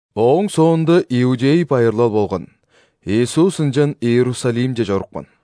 Ооң соонда иудей байырлал болган, Иисус ынчан Иерусалимче чорупкан.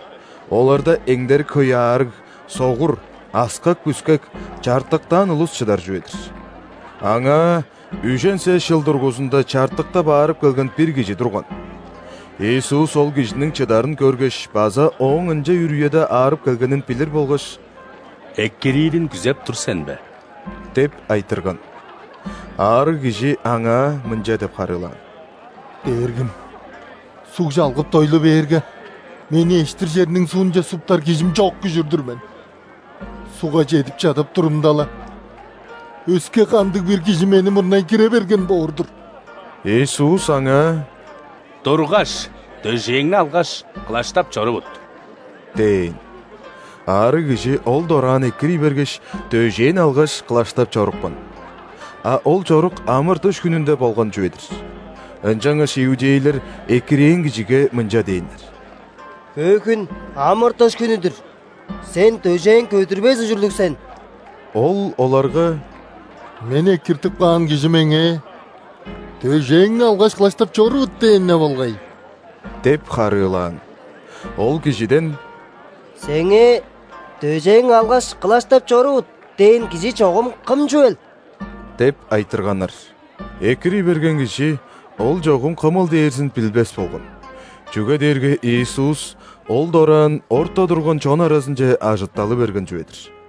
Оларда эңдерик хөй аарыг: согур, аскак-бүскек, чартыктаан улус чыдар чүве-дир. Аңаа үжен сес чыл дургузунда чартыктап аарып келген бир кижи турган. Иисус ол кижиниң чыдарын көргеш база ооң ынча үр үеде аарып келгенин билир болгаш: «Экириирин күзеп тур сен бе?» – деп айтырган. Аарыг кижи Аңаа мынча деп харыылаан: «Дээргим, суг чалгып дойлу бээрге, мени эштир черниң суунче суптар кижим чок күжүр-дүр мен. Сугга чедип чадап турумда-ла, өске кандыг-бир кижи мени мурнай кире берген боор-дур». Иисус аңаа: «Тургаш, дөжээңни алгаш, кылаштап чорувут!» – дээн. Аарыг кижи ол дораан экирий бергеш, дөжээн алгаш, кылаштап чорупкан. А ол чорук ·амыр-дыш хүнүнде болган чүве-дир. Ынчангаш иудейлер экирээн кижиге мынча дээннер: «Бөгүн – амыр-дыш хүнү-дүр. Сен дөжээң көдүрбес ужурлуг сен!» Ол оларга: «Мени экиртип каан Кижи меңээ: „Дөжээңни алгаш, кылаштап чорувут“ – дээн-не болгай» – деп харыылаан. Ол кижиден: «Сеңээ: „Дөжээң алгаш, кылаштап чорувут“ – дээн кижи чогум Кым чүвел?» – деп айтырганнар. Экирий берген кижи Ол чогум Кымыл дээрзин билбес болган, чүге дээрге Иисус ол дораан орта турган чон аразынче ажытталы берген чүве-дир.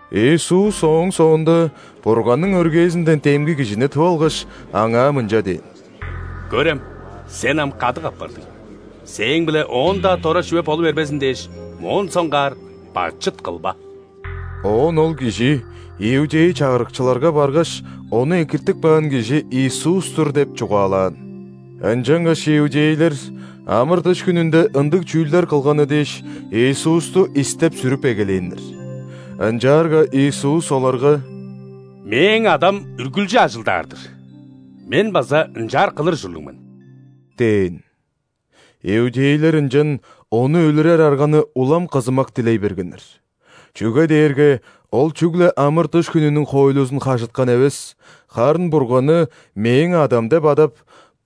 Иисус ооң соонда Бурганның өргээзинден демги кижини тып алгаш, аңаа мынча дээн: «Көрем, сен ам кадык апардың. Сээң-биле оон-даа дора чүве болу бербезин дээш, моон соңгаар бачыт кылба». Оон ол кижи иудей чагырыкчыларга баргаш, ону экиртип каан кижи Иисус-тур деп чугаалаан. Ынчангаш иудейлер амыр-дыш хүнүнде ындыг чүүлдер кылганы дээш, Иисусту истеп-сүрүп эгелээннер. Ынчаарга Иисус оларга: «Мээң Адам үргүлчү ажылдаар-дыр, Мен база ынчаар кылыр ужурлуг мен» – дээн. Иудейлер ынчан Ону өлүрер арганы улам кызымак дилей бергеннер. Чүге дээрге Ол чүгле амыр-дыш хүнүнүң хоойлузун хажыткан эвес, харын Бурганны «Мээң Адам» деп адап,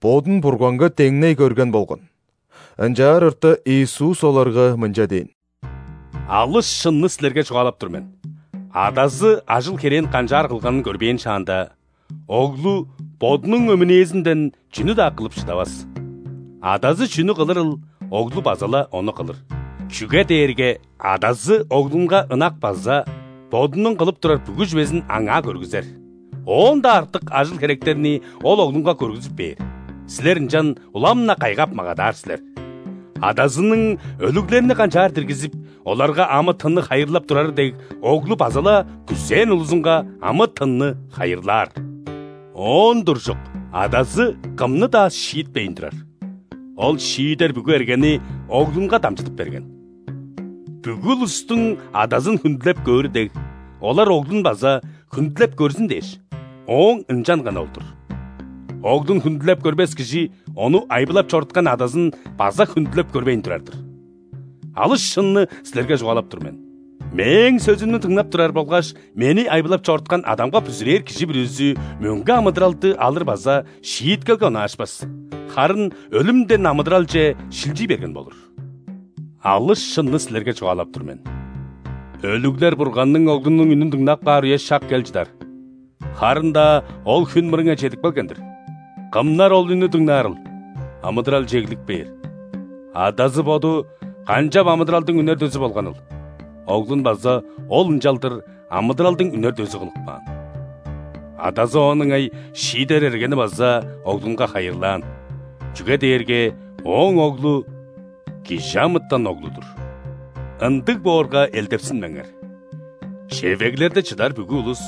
Бодун Бурганга деңней көрген болган. Ынчаар орта Иисус оларга мынча дээн: «Алыс шынны силерге чугаалап тур мен: Адазы ажыл-херээн канчаар кылганын көрбээн шаанда, Оглу Бодунуң өмүнээзинден чүнү-даа кылып шыдавас. Адазы чүнү кылырыл, Оглу база-ла ону кылыр. Чүге дээрге Адазы Оглунга ынак база Бодунуң кылып турар бүгү чүвезин Аңаа көргүзер. Оон-даа артык ажыл-херектерни Ол Оглунга көргүзүп бээр, силер ынчан улам-на кайгап магадаар силер. Адазының өлүглерни канчаар диргизип, оларга амы-тынны хайырлап турары дег, Оглу база-ла күзээн улузунга амы-тынны хайырлаар. Оон туржук, Адазы кымны-даа шиитпейн турар, Ол шиидер бүгү эргени Оглунга дамчыдып берген. Бүгү улустуң Адазын хүндүлеп көөрү дег, олар Оглун база хүндүлеп көрзүн дээш, Ооң ынчанганы ол-дур. Оглун хүндүлеп көрбес кижи Ону айбылап чоруткан Адазын база хүндүлеп көрбейн турар-дыр. Алыс шынны силерге чугаалап тур мен: Мээң сөзүмнү дыңнап турар болгаш Мени айбылап чоруткан Адамга бүзүрээр кижи бүрүзү мөңге амыдыралды алыр база шииткелге онаашпас, харын өлүмден амыдыралче шилчий берген болур. Алыс шынны силерге чугаалап тур мен: өлүглер Бурганның Оглунуң үнүн дыңнап каар үе-шак кел чыдар, харын-даа ол хүн мырыңай чедип келген-дир. Кымнар ол үннү дыңнаарыл, амыдыралче эглип кээр. Адазы Боду канчап амыдыралдың үнер дөзү болганыл, Оглун база Ол ынчалдыр амыдыралдың үнер дөзү кылып каан. Адазы оон ыңай шиидер эргени база Оглунга хайырлаан, чүге дээрге Ооң Оглу – ·Кижи амытан Оглу-дур. Ындыг боорга, элдепсинмеңер: чевеглерде чыдар бүгү улус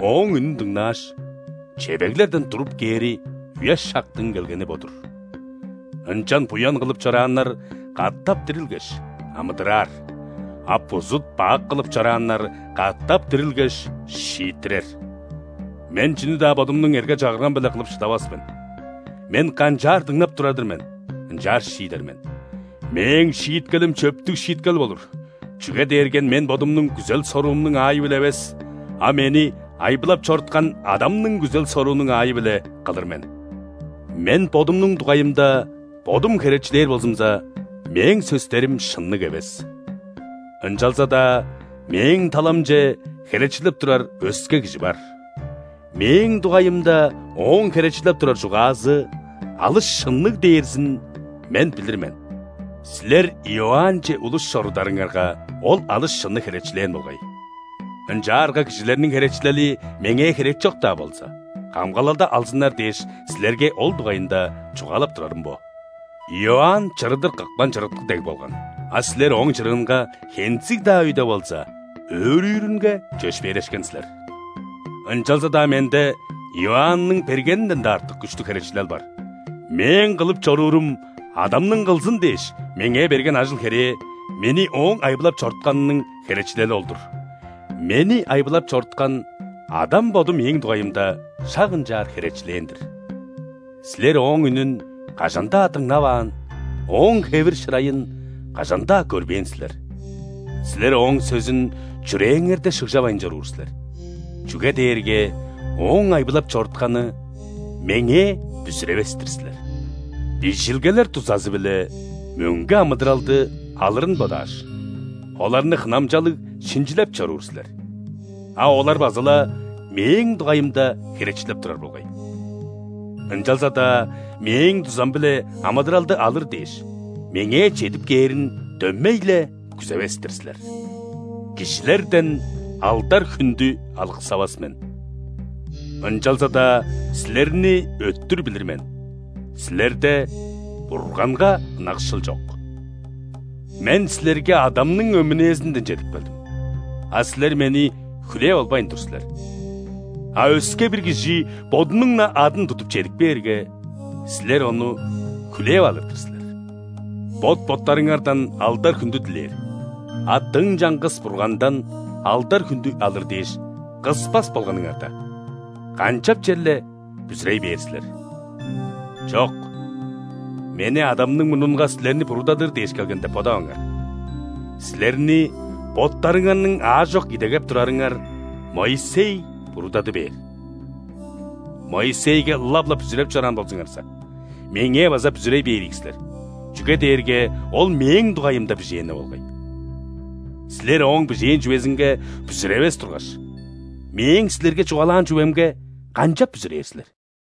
Ооң үнүн дыңнааш, чевеглерден туруп кээри үе-шактың келгени бо-дур. Ынчан буян кылып чорааннар катап дирилгеш, амыдыраар, а бузут-бак кылып чорааннар катап дирилгеш, шииттирер. Мен чүнү-даа Бодумнуң эрге-чагыргам-биле кылып шыдавас мен. Мен канчаар дыңнап турар-дыр мен, ынчаар шиидер мен. Мээң шииткелим чөптүг шииткел болур, чүге дээрге Мен Бодумнуң күзел-соруумнуң аайы-биле эвес, а Мени айбылап чоруткан Адамның күзел-соруунуң аайы-биле кылыр мен». «Мен Бодумнуң дугайымда Бодум херечилээр болзумза, Мээң сөстерим шынныг эвес. Ынчалза-даа Мээң таламче херечилеп турар өске кижи бар. Мээң дугайымда ооң херечилеп турар чугаазы алыс шынныг дээрзин Мен билир мен. Силер Иоаннче улус чорударыңарга, ол алыс шынны херечилээн болгай. Ынчаарга кижилерниң херечилели Меңээ херекчок-даа болза, камгалалды алзыннар дээш, силерге ол дугайында чугаалап турарым бо. Иоанн чырыдыр кыпкан чырыткы дег болган. А силер ооң чырыынга, хензиг-даа өйде болза, өөрүүрүнге чөпшээрешкен силер. Ынчалза-даа Менде Иоанның бергенинден-даа артык күштүг херечилел бар. Мээң кылып чоруурум, Адамның кылзын дээш Меңээ берген ажыл-херээ – Мени Ооң айбылап чорутканының херечилели ол-дур! Мени айбылап чоруткан Адам Боду Мээң дугайымда шак ынчаар херечилээн-дир. Силер Ооң үнүн кажан-даа дыңнаваан, Ооң хевир-шырайын кажан-даа көрбээн силер. Силер Ооң сөзүн чүрээңерде шыгжавайн чоруур силер, чүге дээрге Ооң айбылап чорутканы Меңээ бүзүревес-тир силер. Бижилгелер дузазы-биле мөңге амыдыралды алырын бодааш, оларны хынамчалыг шинчилеп чоруур силер. А олар база-ла Мээң дугайымда херечилеп турар болгай. Ынчалза-даа Мээң дузам-биле амыдыралды алыр дээш, Меңээ чедип кээрин дөмей-ле күзевес-тир силер. Кижилерден алдар-хүндү алыксавас мен. Ынчалза-даа силерни өттүр билир мен: силерде Бурганга ынакшыл чок! Мен силерге Адамның өмүнээзинден чедип келдим, а силер Мени хүлээп албайн тур силер. А өске-бир кижи бодунуң-на адын тудуп чедип кээрге, силер ону хүлээп алыр-дыр силер! Бот-боттарыңардан алдар-хүндү дилээр, а дың чаңгыс Бургандан алдар-хүндү алыр дээш кыспас болганыңарда, канчап черле бүзүрей бээр силер?! Чок, Мени Адамның мурнунга силерни буруудадыр дээш келген деп бодаваңар. Силерни боттарыңарның аажок идегеп турарыңар Моисей буруудады бээр. Моисейге ылап-ла бүзүреп чораан болзуңарза, Меңээ база бүзүрей бээр ийик силер, чүге дээрге ол Мээң дугайымда бижээн-не болгай. Силер ооң бижээн чүвезинге бүзүревес тургаш, Мээң силерге чугаалаан чүвемге канчап бүзүрээр силер?»